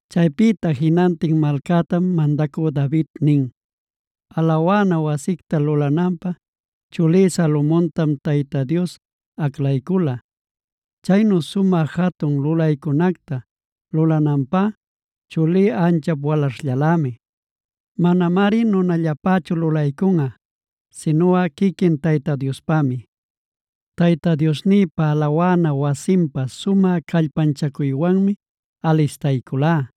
Chaypïta jinantin malcätam mandacü David nin: “Alawana wasicta lulananpä chulí Salomontam Tayta Dios aclaycula. Caynu sumä jatun lulaycunacta lulaycunanpä chulí anchap walaśhllalämi. Manamari nunallapächu lulaycunꞌa sinuꞌa quiquin Tayta Diospämi. Tayta Diosnïpa alawana wasinpä sumä callpanchacuywanmi alistayculá: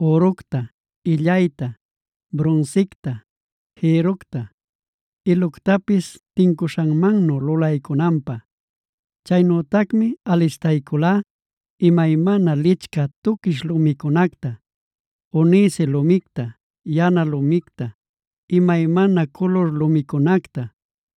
üructa, illayta, brunsicta, jïrructa, iluctapis tincuśhanmannu lulaycunanpä. Chaynütacmi alistayculá imaymana licchä tuquish lumicunacta, onice lumicta, yana lumicta, imaymana culur lumicunacta,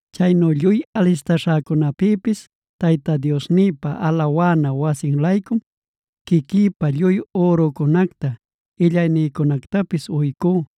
Chaynu lluy alistaśhäcunäpïpis Tayta Diosnïpa alawana wasin-laycum quiquïpa lluy ürücunacta illaynïcunactapis uycú: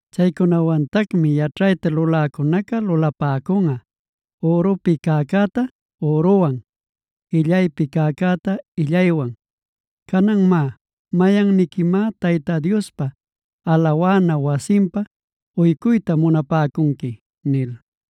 Chaycunawantacmi yaćhayta luläcunaca lulapäcunꞌa ürupi cäcäta üruwan, illaypi cäcäta illaywan. Canan má, ¿mayanniquimá Tayta Diospa alawana wasinpä uycuyta munapäcunqui?” nil.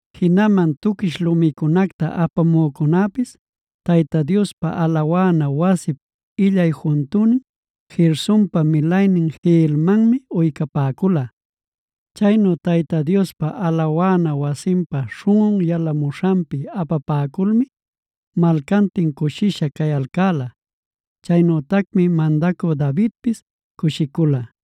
Jinaman tuquish lumicunacta apamücunäpis Tayta Diospa alawana wasip illay juntünin, Gersonpa milaynin Jehielmanmi uycapäcula. Chaynu Tayta Diospa alawana wasinpa śhunꞌun yalamuśhanpi apapäculmi malcantin cushisha cayalcäla. Chaynütacmi mandacü Davidpis cushicula.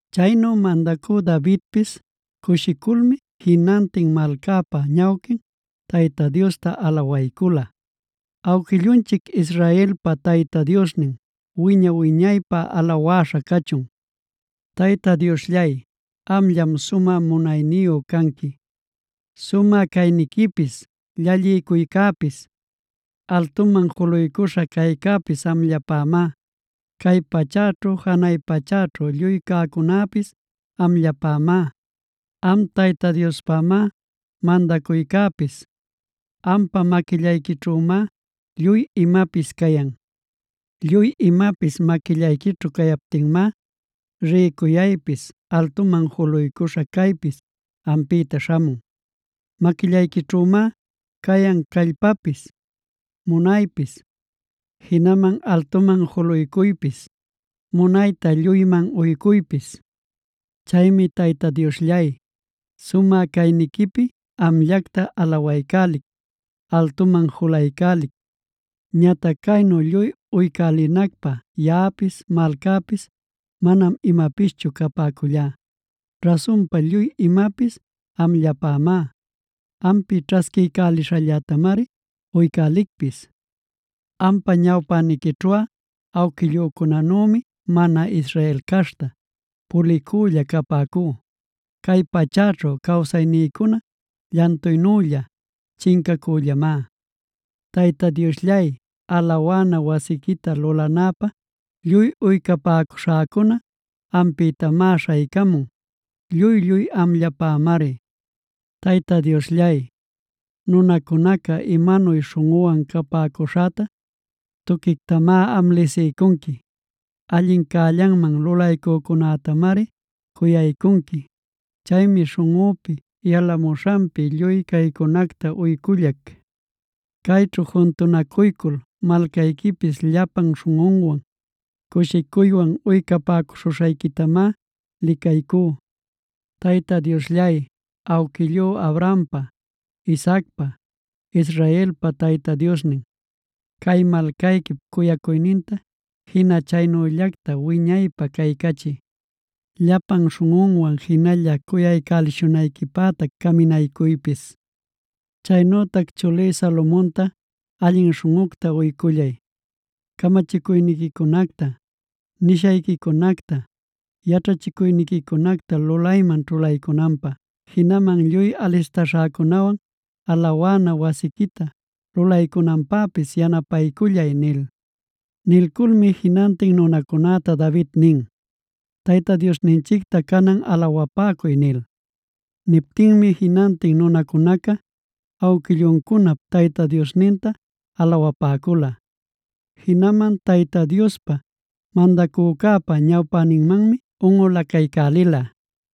Chaynu mandacü Davidpis cushiculmi, jinantin malcäpa ñawquin Tayta Diosta alawaycula: “Awquillunchic Israelpa Tayta Diosnin wiña-wiñaypä alawäśha cachun. Tayta Diosllay, amllam sumä munayniyu canqui;b sumä cayniquipis, llalliycuycäpis, altuman juluycuśha caycäpis amllapämá. Cay pachäćhu janay pachäćhu lluy cäcunäpis amllapämá. Am Tayta Diospamá mandacuycäpis; ampa maquillayquićhümá lluy imapis cayan. “Lluy imapis maquillayquićhu cayaptinmá, rïcuyaypis altuman juluycuśha caypis ampïta śhamun. Maquillayquićhümá cayan callpapis, munaypis, jinaman altuman juluycuypis, munayta lluyman uycuypis. Chaymi Tayta Diosllay, sumä cayniquipi amllacta alawaycälic, altuman julaycälic. “Ñatac caynu lluy uycälinacpä yaꞌapis, malcäpis manam imapischu capäcullá. Rasunpa lluy imapis amllapamá; ampi ćhasquiycälishallätamari uycälicpis. Ampa ñawpäniquićhuꞌa awquillücunanümi mana Israel caśhta, pulicülla capäcú. Cay pachäćhu cawsaynïcuna llantuynülla chincacüllamá. Tayta Diosllay, alawana wasiquita lulanäpä lluy uycapäcuśhäcuna ampïtamá śhaycamun; lluy-lluy amllapamari. “Tayta Diosllay, nunacunaca imanuy śhunꞌüwan capäcuśhäta tuquictamá am lisiycunqui. Allin cällanman lulaycücunätamari cuyaycunqui. Chaymi śhunꞌüpi yalamuśhanpi lluy caycunacta uycullac. Cayćhu juntunacuycul malcayquipis llapan śhunꞌunwan cushicuywan uycapäcuśhuśhayquitamá licaycú. Tayta Diosllay, awquillú Abrahampa, Isaacpa, Israelpa Tayta Diosnin, cay malcayquip cuyacuyninta jina chaynüllacta wiñaypä caycachiy. Llapan śhunꞌunwan jinalla cuyaycälishunayquipätac caminaycuypis. Chaynütac chulí Salomonta allin śhunꞌucta uycullay, camachicuyniquicunacta, nishayquicunacta, yaćhachicuyniquicunacta lulayman ćhulaycunanpä. Jinaman lluy alistaśhäcunawan alawana wasiquita lulaycunanpäpis yanapaycullay” nil. Nilculmi jinantin nunacunäta David nin: “Tayta Diosninchicta canan alawapäcuy” nil. Niptinmi jinantin nunacunaca awquilluncunap Tayta Diosninta alawapäcula. Jinaman Tayta Diospa, mandacücäpa ñawpäninmanmi unꞌulacaycälila.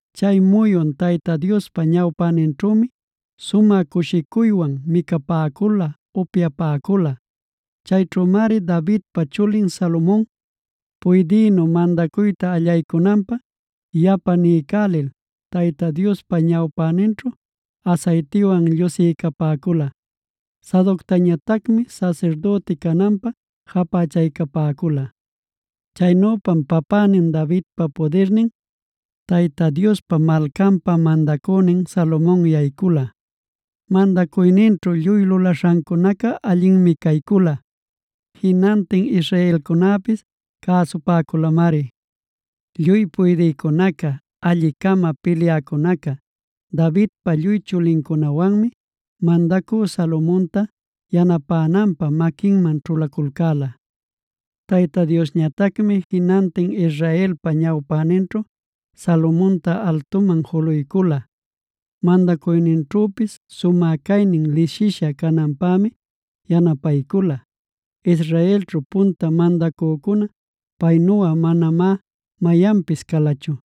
Chay muyun Tayta Diospa ñawpäninćhümi sumä cushicuywan micapäcula, upyapäcula. Chayćhümari Davidpa chulin Salomon, puydïnu mandacuyta allaycunanpä yapa niycälil, Tayta Diospa ñawpäninćhu asaytiwan llusiycapäcula. Sadoctañatacmi sasirdüti cananpä japächaycapäcula. Chaynüpam papänin Davidpa pudirninc Tayta Diospa malcanpä mandacünin Salomon yaycula. Mandacuyninćhu lluy lulaśhancunaca allinmi caycula. Jinantin israelcunäpis cäsupäculamari. Lluy puydïcunaca, alli-cama pilyäcunaca, Davidpa lluy chulincunawanmi mandacü Salomonta yanapänanpä maquinman ćhulaculcäla. Tayta Diosñatacmi jinantin Israelpa ñawpäninćhu Salomonta altuman juluycula; mandacuyninćhüpis sumä caynin lisisha cananpämi yanapaycula. Israelćhu punta mandacücuna paynuꞌa manamá mayanpis calachu.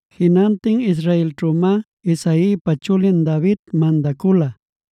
Jinantin israelćhümá Isaipa chulin David mandacula.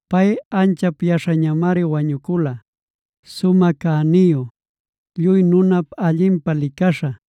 Pay anchap yaśhañamari wañucula, sumä cäniyu, lluy nunap allinpä licaśha.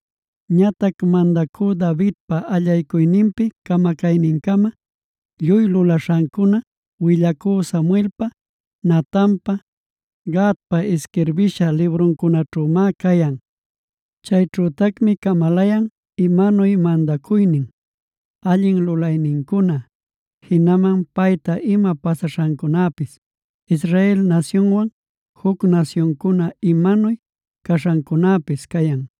Ñatac mandacü Davidpa allaycuyninpi camacaynincama lluy lulaśhancuna willacü Samuelpa, Natanpa, Gadpa isquirbisha libruncunaćhümá cayan. Chayćhütacmi camalayan: imanuy mandacuynin, allin lulaynincuna, jinaman payta ima pasaśhancunapis, Israel nasyunwan juc nasyuncuna imanuy caśhancunapis cayan.